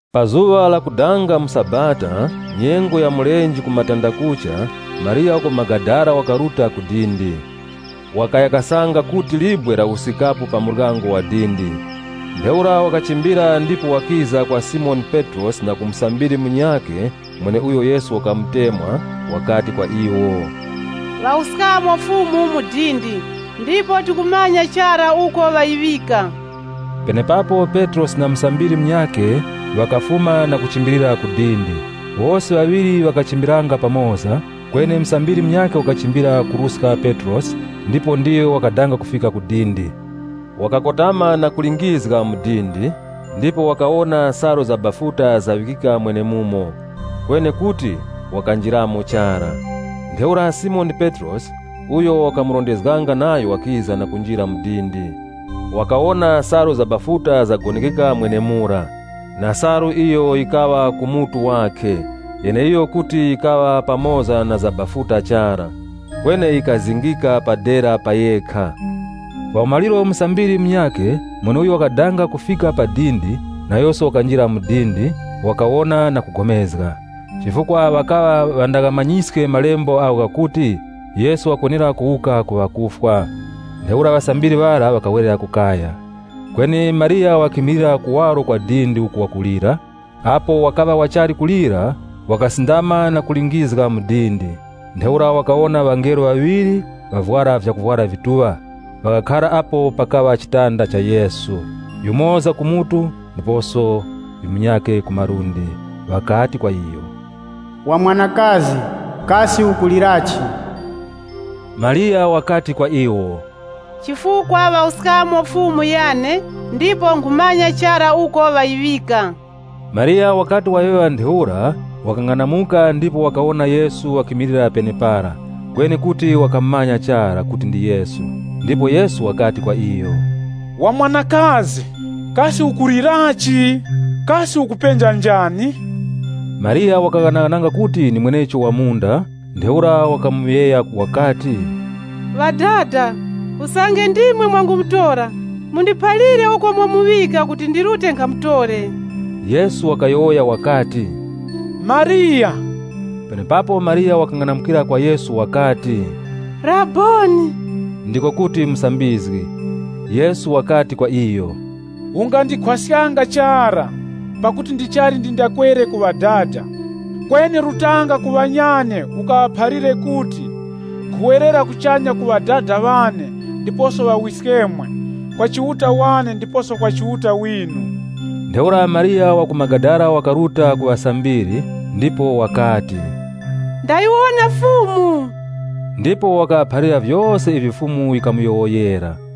Pa zuŵa lakudanga mu sabata, nyengo ya mulenje ku matandakucha, Mariya wa ku Magadala, wakaruta ku dindi. Wakaya kasanga kuti libwe lawuskikapo pa muryango wa dindi. Ntheura wakachimbira ndipo wakiza kwa Simoni Petrosi na ku musambiri munyakhe mweneuyo Yesu wakamutemwa, wakati kwa iwo, “Ŵawuskamo Fumu mu dindi, ndipo tikumanya chara uko ŵayiŵika.” Penepapo Petrosi na musambiri munyakhe ŵakafuma na kuchimbilira ku dindi. Wose ŵaŵiri ŵakachimbiranga pamoza, kweni musambiri munyakhe wakachimbira kuruska Petrosi ndipo ndiyo wakadanga kufika ku dindi. Wakakotama na kulingizga mu dindi, ndipo wakawona salu za bafuta zaŵikika mwenemumo. Kweni kuti wakanjiramo chara. Ntheura Simoni Petrosi, uyo wakamurondezganga nayo wakiza na kunjira mu dindi. Wakawona salu za bafuta zagonekeka mwenemura, na salu iyo yikaŵa ku mutu wakhe, yeneiyo kuti yikaŵa pamoza na za bafuta chara, kweni yikazingika pa dera pa yekha. Pa umaliro musambiri munyakhe, mweneuyo wakadanga kufika pa dindi, nayoso wakanjira ku dindi, ŵakawona, na kupulikana. Chifukwa ŵakaŵa ŵandaghamanyiske malembo agho ghakuti, Yesu wakwenera kuwuka ku wakufwa. Ntheura ŵasambiri ŵara ŵakawerera ku kaya. Kweni Mariya wakimilira kuwaro kwa dindi uku wakulira. Apo wakaŵa wachali kulira, wakasindama na kulingizga mu dindi. Ntheura wakawona ŵangelo ŵaŵiri, ŵavwara vyakuvwara vituŵa. Ŵakakhara apo pakaŵa chitanda cha Yesu, yumoza ku mutu ndiposo munyakhe ku malundi. Ŵakati kwa iyo, “Wa mwanakazi, kasi ukulirachi?” Mariya wakati kwa iwo, “Chifukwa ŵawuskamo Fumu yane, ndipo nkhumanya chara uko ŵayiŵika.” Mariya wakati wayowoya ntheura wakang'anamuka, ndipo wakawona Yesu wakimilira penepara. Kweni kuti wakamumanya chara kuti ndi Yesu. Ndipo Yesu wakati kwa iyo, “Wa mwanakazi, kasi ukulirachi? Kasi ukupenja njani?” Mariya wakaghanaghananga kuti ndi mwenecho wa munda. Ntheura wakamuŵeya wakati, “Ŵadada, usange ndimwe mwangumutora mundiphalire uko mwamuŵika kuti ndirute nkhamutore.” Yesu wakati kwa iyo, “Mariya!” Penepapo Mariya wakang'anamukira kwa Yesu wakati mu chiHebere, “Rabboni!” (Ndiko kuti “Musambizgi.”) Yesu wakati kwa iyo, “Ungandikhwaskanga chara, pakuti ndichali ndindakwere ku Ŵadada. Kweni rutanga ku ŵanyane ukaŵaphalire kuti, ‘Nkhuwerera kuchanya ku Ŵadada ŵane ndiposo ŵawiskemwe, kwa Chiuta wane ndiposo kwa Chiuta winu.’” Ntheura Mariya wa ku Magadala wakaruta ku ŵasambiri, ndipo wakati, “Ndayiwona Fumu.” Ndipo wakaŵaphalira vyose ivyo Fumu yikamuyowoyera.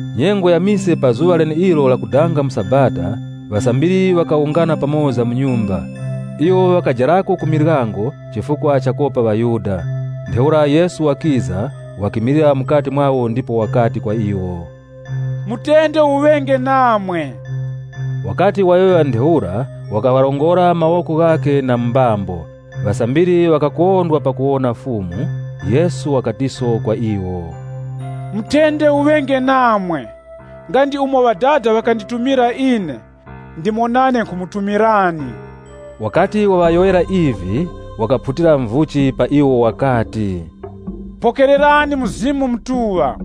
Nyengo ya mise pa zuŵa leneilo lakudanga mu sabata, ŵasambiri ŵakawungana pamoza mu nyumba. Iwo ŵakajarako ku miryango chifukwa chakopa ŵaYuda. Ntheura Yesu wakiza, wakimilira mukati mwawo, ndipo wakati kwa iwo, “Mutende uŵenge namwe.” Wakati wayowoya ntheura, wakaŵarongora mawoko ghakhe na mu mbambo. Ŵasambiri ŵakakondwa pakuwona Fumu. Yesu wakatiso kwa iwo, “Mutende uŵenge namwe! Nga ndi umo Ŵadada ŵakanditumira ine, ndimo nane nkhumutumirani.” Wakati waŵayowoyera ivi, wakaphutira muvuchi pa iwo wakati, “Pokererani Mzimu Mutuŵa.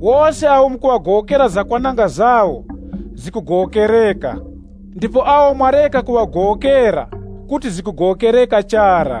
Wose awo mukuŵagowokera zakwananga zawo, zikugowokereka, ndipo awo mwareka kuŵagowokera, kuti zikugowokereka chara.”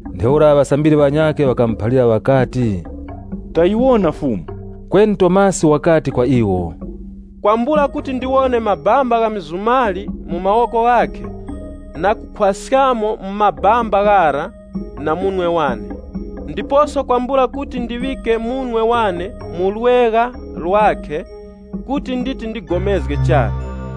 Ntheura ŵasambiri ŵanyakhe ŵakamuphalira ŵakati, “Tayiwona Fumu.” Kweni Tomasi wakati kwa iwo, “Kwambula kuti ndiwone mabamba gha mizumali mu mawoko ghakhe, na kukhwaskamo mu mabamba ghara na munwe wane, ndiposo kwambula kuti ndiŵike munwe wane mu lwegha lwakhe, kuti nditi ndipulikanenge chara.”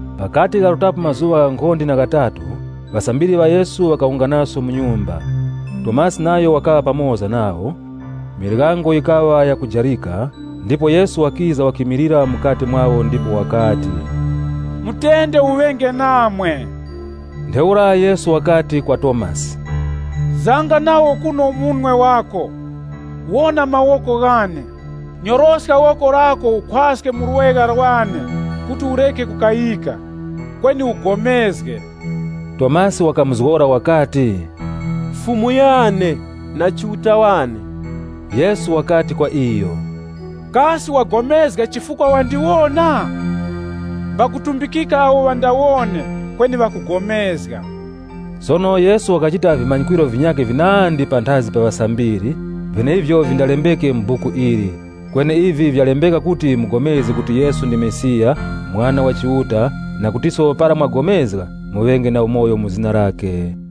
Ghakati gharutapo mazuŵa ghankhonde na ghatatu, ŵasambiri ŵa Yesu ŵakawunganaso mu nyumba. Tomasi nayo wakaŵa pamoza nawo. Miryango yikaŵa yakujarika, ndipo Yesu wakiza, wakimilira mukati mwawo ndipo wakati, “Mutende uŵenge namwe.” Ntheura Yesu wakati kwa Tomasi, “Zanga nawo kuno munwe wako, wona mawoko ghane. Nyoroska woko lako ukhwaske mu lwegha lwane kuti ureke kukayika, kweni ugomezge.” Tomasi wakamuzgora wakati, “Fumu yane, na Chiuta wane!” Yesu wakati kwa iyo, “Kasi wapulikana chifukwa wandiwona? Mbakutumbikika awo ŵandawone kweni ŵakupulikana.” Sono Yesu wakachita vimanyikwiro vinyakhe vinandi panthazi pa ŵasambiri, vyeneivyo vindalembeke mu buku ili. Kweni ivi vyalembeka kuti mupulikane kuti Yesu ndi Mesiya, Mwana wa Chiuta, na kutiso para mwapulikana, muŵenge na umoyo mu zina lakhe.